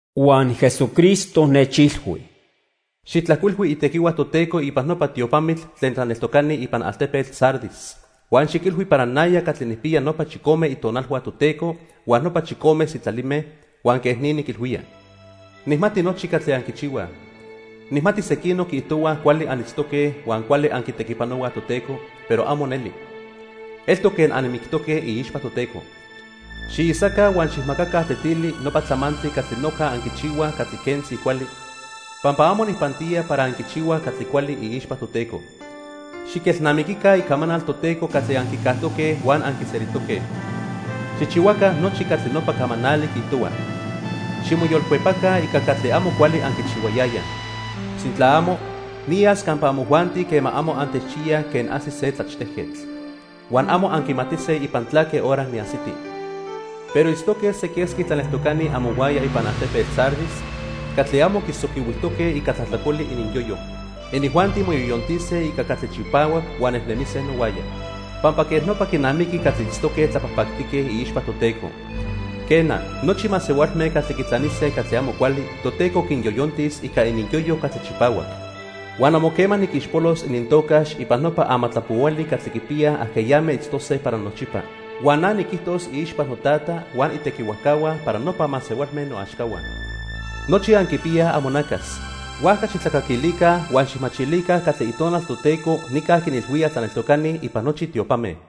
Huan Jesucristo nechilhui: "Xijtlajcuilhui itequihua Toteco ipan nopa tiopamitl tlen tlaneltocani ipan altepetl Sardis huan xiquilhui para naya catli nijpiya nopa chicome itonalhua Toteco huan nopa chicome sitlalime, huan quej ni niquilhuía: Nijmati nochi catli anquichihuaj. Nijmati sequinoc quiijtohuaj cuali anitztoque huan cuali anquitequipanohuaj Toteco, pero amo neli. Eltoc quen anmictoque iixpa Toteco. Xiisaca huan xijmacaca tetili nopa tlamantli catli noja anquichihuaj catli quentzi cuali, pampa amo nijpantía para anquichihuaj catli cuali iixpa Toteco. Xiquelnamiquica icamanal Toteco catli anquicajtoque huan anquiselijtoque. Xijchihuaca nochi catli nopa camanali quiijtohua. Ximoyolcuepaca ica catli amo cuali anquichihuayayaj. Sintla amo, niyas campa amojuanti quema amo antechchiyaj quen ajsi se tlachtejquetl. Huan amo anquimatise ipan tlaque hora niajsiti. Pero itztoque se quesqui tlaneltocani amohuaya ipan altepetl Sardis catli amo quisoquihuijtoque ica tlajtlacoli ininyoyo. Inijuanti moyoyontise ica catli chipahuac huan nejnemise nohuaya, pampa quej nopa quinamiqui catli itztoque tlapajpactique iixpa Toteco. Quena, nochi masehualme catli quitlanise catli amo cuali Toteco quinyoyontis ica ininyoyo catli chipahuac. Huan amo quema niquixpolos inintocax ipan nopa amatlapohuali catli quipiya ajqueyame itztose para nochipa. Huan na niquijtos iixpa noTata huan itequihuajcahua para nopa masehualme noaxcahua. Nochi anquipiyaj amonacas, huajca xijtlacaquilica huan xijmachilica catli Itonal Toteco nica quinilhuía tlaneltocani ipan nochi tiopame."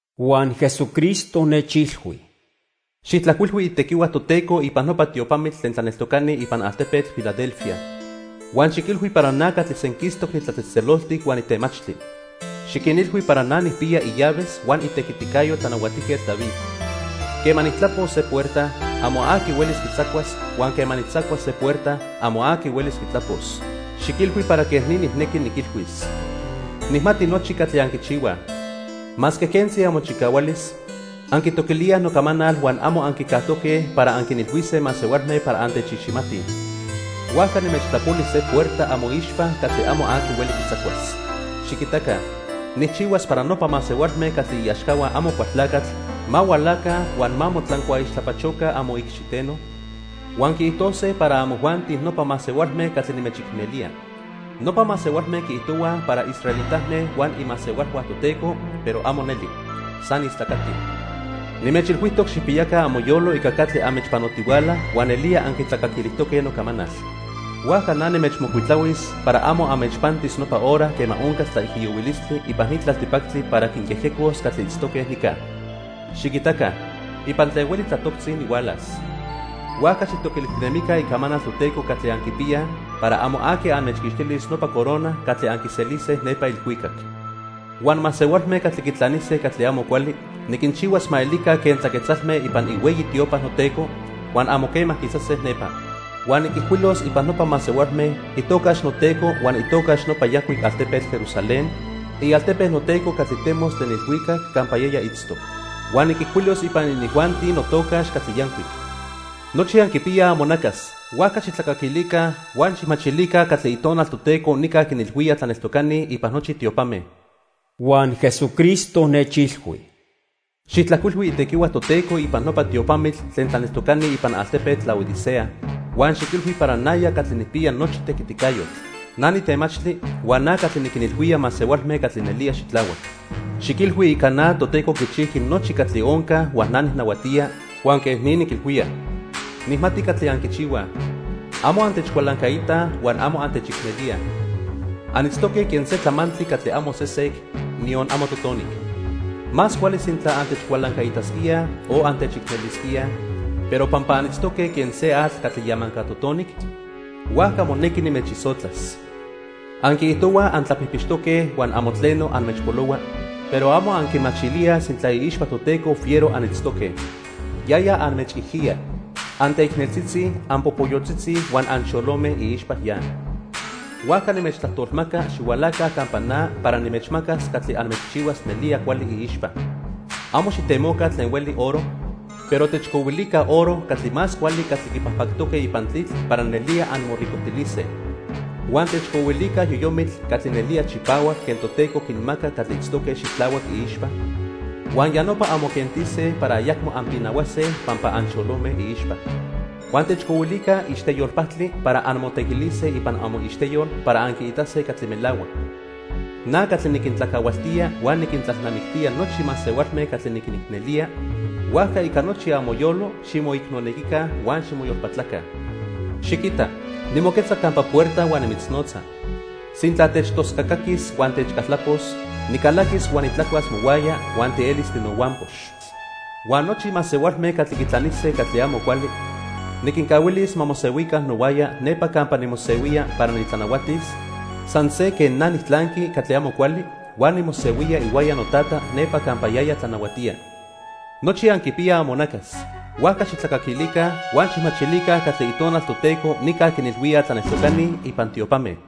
Huan Jesucristo nechilhui: "Xijtlajcuilhui itequihua Toteco ipan nopa tiopamitl tlen tlaneltocani ipan altepetl Filadelfia huan xiquilhui para na catli senquistoc nitlatzejtzeloltic huan nitemachtli. Xiquinilhui para na nijpiya illaves huan itequiticayo Tlanahuatijquetl David. Quema nijtlapos se puerta, amo aqui huelis quitzacuas huan quema nijtzacuas se puerta, amo aqui huelis quitlapos. Xiquilhui para quej ni nijnequi niquilhuis: Nijmati nochi catli anquichihuaj. Masque quentzi amochicahualis, anquitoquilíaj nocamanal huan amo anquicajtoque para anquinilhuise masehualme para antechiximatij. Huajca nimechtlapoli se puerta amoixpa catli amo aqui hueli quitzacuas. Xiquitaca, nijchihuas para nopa masehualme catli iaxcahua Amocualtlacatl ma hualaca huan ma motlancuaixtlapachoca amoicxiteno, huan quiijtose para amojuanti nopa masehualme catli nimechicnelía. Nopa masehualme quiijtohuaj para israelitame huan imasehualhua Toteco, pero amo neli. San istlacatij. Nimechilhuijtoc xijpiyaca amoyolo ica catli anmechpanotihuala huan nelía anquitlacaquilijtoque nocamanal, huajca na nimechmocuitlahuis para amo anmechpantis nopa hora quema oncas tlaijiyohuilistli ipan ni tlaltipactli para quinyejyecos catli itztoque nica. Xiquitaca, ipan tlen hueli tlatoctzi nihualas. Huajca xijtoquilijtinemica icamanal Toteco catli anquipiyaj para amo aqui anmechquixtilis nopa corona catli anquiselise nepa ilhuicac. Huan masehualme catli quitlanise catli amo cuali niquinchihuas ma elica quen tlaquetzalme ipan ihueyi tiopa noTeco, huan amo quema quisase nepa. Huan niquijcuilos ipan nopa masehualme itocax noTeco huan itocax nopa yancuic altepetl Jerusalén, ialtepe noTeco catli temos tlen ilhuicac campa yaya itztoc. Huan niquijcuilos ipan inijuanti notocax catli yancuic. Nochi anquipiyaj amonacas, huajca xijtlacaquilica huan xijmachilica catli Itonal Toteco nica quinilhuía tlaneltocani ipan nochi tiopame." Huan Jesucristo nechilhui: "Xijtlajcuilhui itequihua Toteco ipan nopa tiopamitl tlen tlaneltocani ipan altepetl Laodicea huan xiquilhui para naya catli nijpiya nochi tequiticayotl. Na nitemachtli huan na catli niquinilhuía masehualme catli nelía xitlahuac. Xiquilhui ica na Toteco quichijqui nochi catli onca huan na nijnahuatía, huan quej ni niquilhuía: Nijmati catli anquichihuaj. Amo antechcualancaitaj huan amo antechicnelíaj. Anitztoque quen se tlamantli catli amo sesec, niyon amo totonic. Más cuali sintla antechcualancaitasquíaj o antechicnelisquíaj, pero pampa anitztoque quen se atl catli yamanca totonic, huajca monequi nimechisotlas. Anquiijtohuaj antlapijpixtoque huan amo tleno anmechpolohua, pero amo anquimachilíaj sintla iixpa Toteco fiero anitztoque. Yaya anmechijiya. Anteicneltzitzi, anpopoyotzitzi huan anxolome iixpa ya. Huajca nimechtlajtolmaca xihualaca campa na para nimechmacas catli anmechchihuas nelía cuali iixpa. Amo xijtemoca tlen hueli oro, pero techcohuilica oro catli más cuali catli quipajpactoque ipan tlitl para nelía anmoricojtilise. Huan techcohuilica yoyomitl catli nelía chipahuac quen Toteco quinmaca catli itztoque xitlahuac iixpa, huan ya nopa anmoquentise para ayacmo anpinahuase pampa anxolome iixpa. Huan techcohuilica ixteyol pajtli para anmotequilise ipan amoixteyol para anquiitase catli melahuac. Na catli niquintlacahualtía huan niquintlalnamictía nochi masehualme catli niquinicnelía, huajca ica nochi amoyolo ximoicnonequica huan ximoyolpatlaca. Xiquita, nimoquetza campa puerta huan nimitznotza. Sintla techtoscacaquis huan techcaltlapos, nicalaquis huan nitlacuas mohuaya huan tielis tinohuampox. Huan nochi masehualme catli quitlanise catli amo cuali niquincahuilis ma mosehuica nohuaya nepa campa nimosehuía para nitlanahuatis, san se quen na nijtlanqui catli amo cuali huan nimosehuía ihuaya noTata nepa campa yaya tlanahuatía. Nochi anquipiyaj amonacas, huajca xijtlacaquilica huan xijmachilica catli Itonal Toteco nica quinilhuía tlaneltocani ipan tiopame."